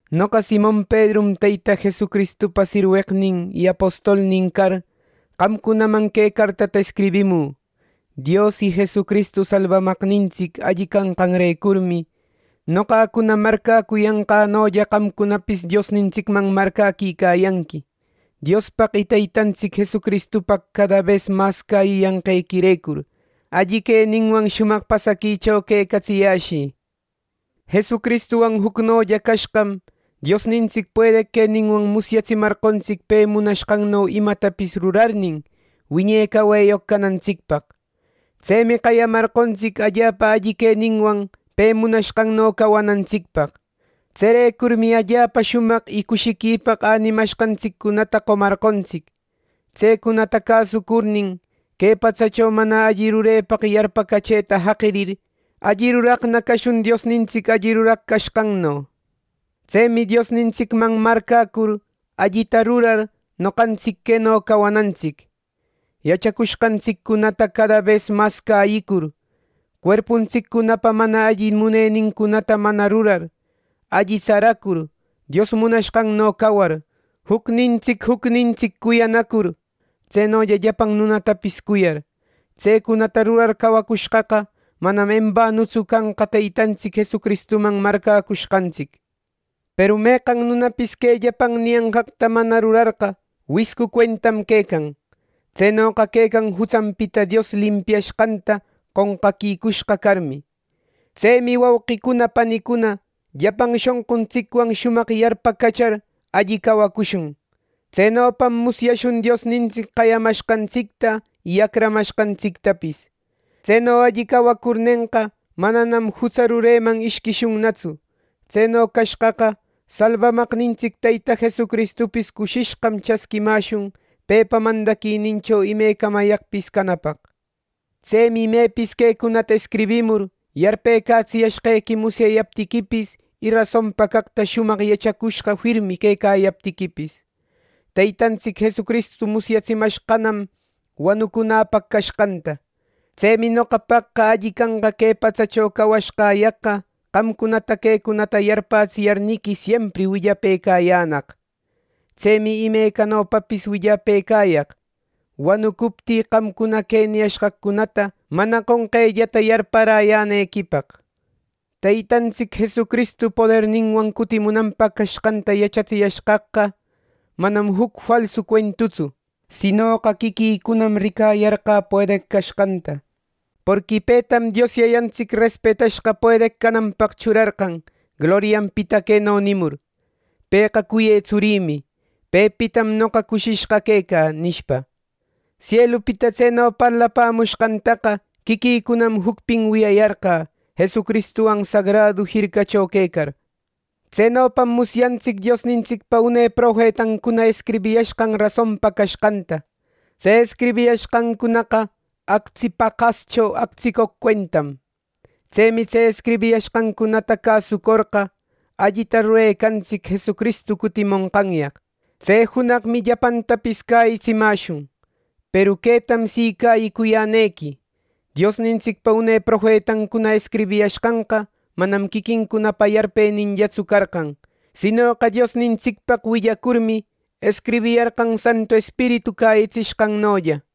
Noqa, Simon Pedrum, Teyta Jesucristupa sirweqnin y apostolnin car, qamcunaman que cartata escribimü. Dios y Jesucristu Salbamaqnintsic alli canqanrecurmi, noqacuna marcäcuyanqänolla qamcunapis Diosnintsicman marcäquicayanqui. Diospaq y Teytantsic Jesuspaq cada bes mas cäyiyanqequirecur, alli queninwan shumaq pasaquicho quecatsiyäshï. Jesucristuwan jucnolla cashqam, Diosnintsic puedeq queninwan musyatsimarqontsic pe munashqanno imatapis rurarnin, wiñe caweyoq canantsicpaq. Tsemi qayamarqontsic allapa alli queninwan pe munashqanno cawanantsicpaq. Tserecurmi allapa shumaq y cushiquipaq änimashqantsiccunata qomarqontsic. Tsecunata cäsucurnin, que patsacho mana alli rurepaq yarpacachëta jaqirir, alli ruraqna cashun Diosnintsic alli ruraq cashqanno. Tsemi Diosnintsicman marcäcur, allita rurar, noqantsic queno cawanantsic: yachacushqantsiccunata cada bes mas cäyicur, cuerpuntsiccunapa mana alli munenincunata manana rurar, alli tsaracur, Dios munashqanno cawar, jucnintsic jucnintsic cuyanacur, tsenolla llapan nunatapis cuyar. Tsecunata rurar cawacushqaqa, manam embanutsu canqa Teytantsic Jesucristuman marcäcushqantsic. Peru meqan nunapis que llapan niyanqaqta mana rurarqa, wiscu cuentam quecan. Tsenoqa quecan jutsanpita Dios limpiashqanta qonqaquicushqa carmi. Tsemi wauqicuna panicuna, llapan shonquntsicwan shumaq yarpacachar alli cawacushun. Tsenopam musyashun Diosnintsic qayamashqantsicta y acramashqantsictapis. Tseno alli cawacurnenqa, mananam jutsa rureman ishquishunnatsu. Tseno cashqaqa, Salbamaqnintsic Teyta Jesucristupis cushishqam chasquimäshun pepa mandaquinincho imecamayaqpis canapaq. Tsemi imepis quecunata escribimur, yarpëcatsiyashqequi musyayaptiquipis y rasonpa caqta shumaq yachacushqa firmi quecayaptiquipis. Teytantsic Jesucristu musyatsimashqanam wanucunäpaq cashqanta. Tsemi noqapaqqa alli canqa que patsacho cawashqäyaqqa qamcunata quecunata yarpätsiyarniqui siempri willapëcayänaq. Tsemi imecanopapis willapëcayaq, wanucuptï qamcuna que niyashqaqcunata mana qonqellata yarparäyänequipaq. Teytantsic Jesucristu poderninwan cutimunanpaq cashqanta yachatsiyashqaqqa, manam juc falsu cuentutsu. Sinoqa quiquïcunam ricayarqä puedeq cashqanta. Porqui petam Dios Yayantsic respetashqa puedeq cananpaq churarqan, glorianpita queno nimur: “Pëqa cuyë Tsurïmi. Pepitam noqa cushishqa quecä” nishpa. Sielupita tseno parlapämushqantaqa quiquïcunam jucpin wiyayarqä, Jesucristuwan sagradu jircacho quecar. Tsenopam musyantsic Diosnintsicpa une profetancuna escribiyashqan rasonpa cashqanta. Tse escribiyashqancunaqa actsi paqascho actsicoq cuentam. Tsemi tse escribishqancunata cäsucorqa, allita rurecanantsic Jesucristu cutimonqanyaq. Tse junaqmi llapantapis cäyitsimäshun. Peru quetam si cäyicuyänequi: Diosnintsicpa une profetancuna escribiyashqanqa manam quiquincunapa yarpeninllatsu carqan; sinoqa Diosnintsicpaq willacurmi, escribiyarqan Santu Espiritu cäyitsishqannolla.